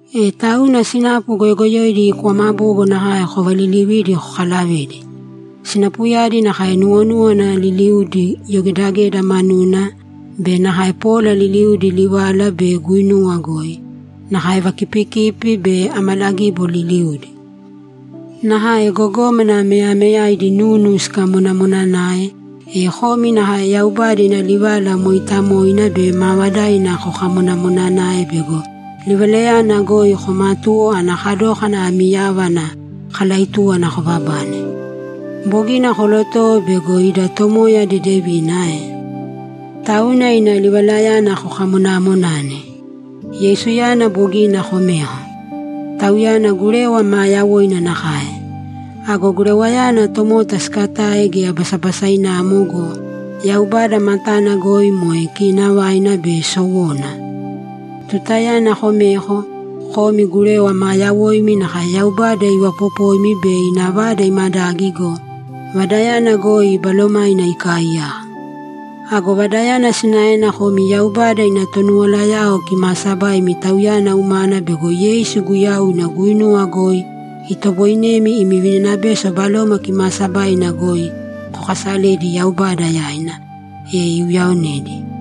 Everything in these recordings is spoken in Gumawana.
E tauna sinapu goyogoyoidi kwama bogo nakae kovalilivīdi kokalavēdi. Sinapuyadi nakae nuwonúwana liliudi yogedageda manuna be nakae pola liliudi livala be guinuwa goi, nakae vakipikipi be amalagibo liliudi. Nakae gogómana meyameyaidi nunu sikamonamonanae, e komi nakae Yaubada ina livala mooitamoina be maavadaina kokamonamonanāe bego livalayana goi koomatuwo ana kadókana ami yava ana kalaitúwana kobabane. Bogina kolotowo bego ida Tomoya dedevina ae? Tauna ina livalayana kokamonamonāne. Yeisuyana bogina komeko. Tauyana gurewa maa yawoina nakae. Ago gurewayana tomota siikatae geya basabasainamo go, Yaubada matana goi moe kiinavaina be sowona. Tutayana komeko, komi gurewa maa yawoimi nakae Yaubada ivapopoimi be ina vada imadagi go, vadayana goi Balomaina ikaaiyaka. Ago vadayana sinaena komi Yaubada ina tonuwalayao kimaasabaimi Tauyana umana bego Yeisu Guyau ina guinuwa goi itoboinemi imi vininabeso Baloma Kimaasabaina goi kokaasaledi Yaubada yaina, e iuyaonedi.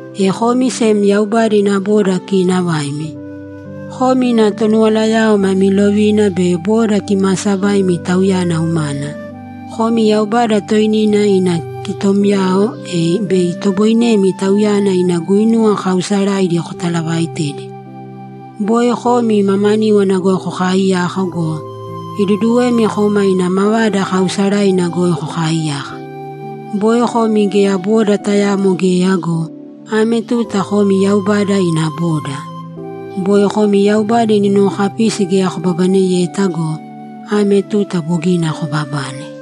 E komi sem Yaubada ina boda kiinavaimi; komi ina tonuwalayao mami lovina be boda kimaasabaimi Tauyana umana; komi Yaubada toinina ina kitomyao, e bei itoboinemi Tauyana ina guinuwa kaausaraidi kotalavaitedi. Boi komi mamaníwana goi kokaaiyaka go, iduduwemi koma ina mavada kaausaraina goi kokaaiyaka. Boi komi geya boda tayamo geya go, ame tuta komi Yaubada ina boda. Boi komi Yaubada ina nuwokapisi geya kobabaneyeta go, ame tuta bogina kobabane.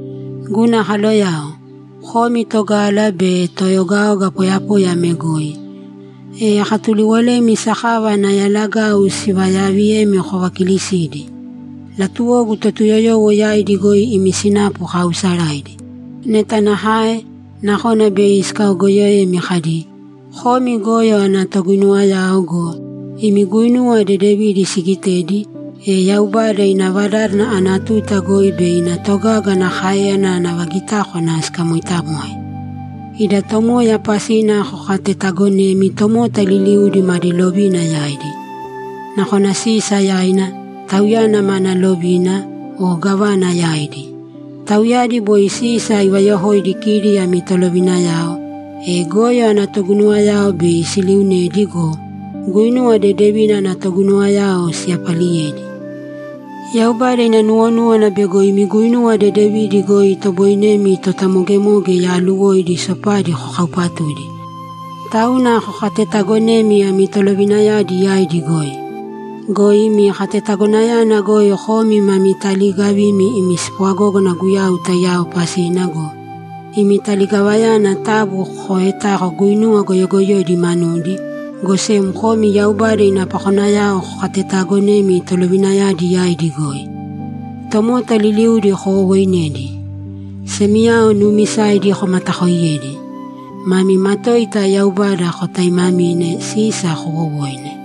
Guna kaloyao, komi togala be toeogaoga poyapoya ame goi, e akatuliwolemi sakava ana yalagau sivayaaviyemi kovakiilisīdi. Latuwogu Totuyoyowo yaidi goi imi sinapu kaausaraidi. Neta nakae, nakona bei sikaogoyoemi kadi, ‘Komi goyo ana toguinuwayao’ go, imi guinuwa dedevidi sigitedi, e Yaubada ina vadádana ana tuta goi bei ina togaga ana káeyana ana vagitákwana sikamoitamoe. Ida Tomoya pasina kokatetaagonēmi tomota liliudi madi lovina yaidi. Nakona Sisa yaina, tauyana mana lovina, o gávana yaidi. Tauyadi boi Sisa ivayokoidi kidi ami tolovinayao, e goyo ana toguinuwayao bei siliunedi go, guinuwa dedevina ana toguinuwayao siyapaliyedi. Yaubada ina nuwonúwana bego imi guinuwa dedevidi goi itoboinemi totamogemoge yaaluwoidi sopadi kokaupatudi. Tauna kokatetaagonēmi ami tolovinayadi yaidi goi. Go imi katetagonayana goi komi ma taliigavimi imi spwagógana Guyau taiyao pasina go, imi taligavayana taabu kooetāko guinuwa goyogoyoidi manudi, go sem komi Yaubada ina pakonayao kokatetaagonēmi tolovinayadi yaidi goi. Tomota liliudi kowowooinēdi. Semiyao nuumisaidi komatakooiyēdi. Mami matoita Yaubada kotaaimamīne. Sisa koowowōine.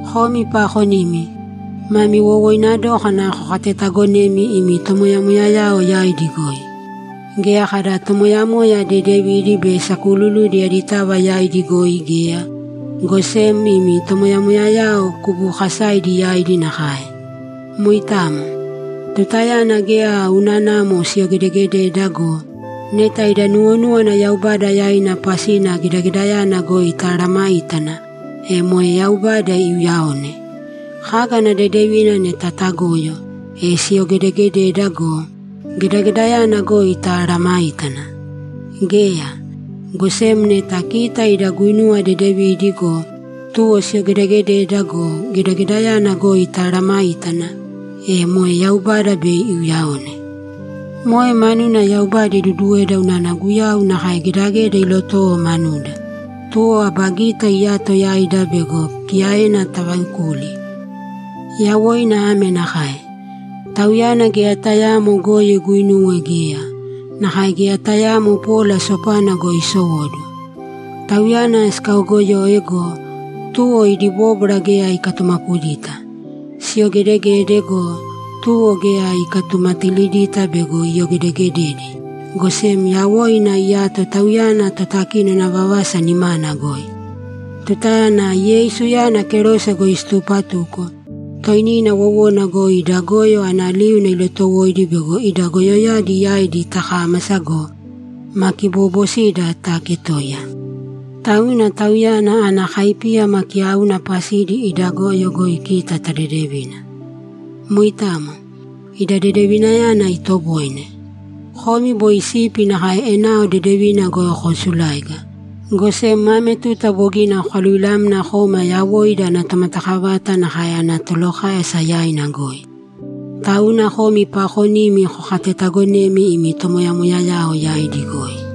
Komi paakonimi, mami wowoina dókana kokatetaagonēmi imi tomoyamoyayao yaidi goi. Geya kada tomoyamoya dedevidi be sakuululudi aditava yaidi goi geya, go sem imi tomoyamoyayao kubuukasaidi yaidi nakae. Moitamo. Tutayana geya unanamo siyogedeegededa go, neta ida nuwonúwana Yaubada yaina pasina gedagedayana goi tamesayágana, e moe Yaubada iuyaone. Kaga ana dedevina neta tagoyo, e siyogedegededa go, gedagedayana goi tamesayágana? Geya! Go sem neta kita ida guinuwa dedevidi go, tuwo siyogedegededa go, gedagedayana goi tamesayágana, e moe Yaubada bei iuyaone. Moe manuna Yaubada iduduweda unana Guyau nakae gedageda ilotowo manuda, tuwo aba gita iyato yaida bego kiyaena tavaekuli. Yawoina ame nakae: Tauyana geya tayaamo goyo iguinuwe geya; nakae geya tayaamo pola sopana goi isowóduwo. Tauyana sikaogoyoe go, tuwo idi bóbwara geya ikatumapudita. Siyogedegede go, tuwo geya ikatumatalidita bego iyogedegededi, go sem yawoina iyato Tauyana Totakinona vavasa nimana goi. Tutayana Yeisuyana kerose goi situpatuko, toinina wowona goi ida goyo ana liuna ilotowoidi bego ida goyoyadi yaidi takámasa go, ma kiboobosida taaketoiya. Tauna Tauyana ana kaipíyama kiyauna pasidi ida goyo goi kita tadedevina. Moitamo, ida dedevinayana itoboine. Komi boi sipi nakae enao dedevina goi koosuláiga, go sem ame tuta bogina kokaluvilamna koma yawoida ana Tomatakavata nakae ana Tolokáyasa yaina goi. Tauna komi paakonimi kokatetaagonēmi imi tomoyamoyayao yaidi goi.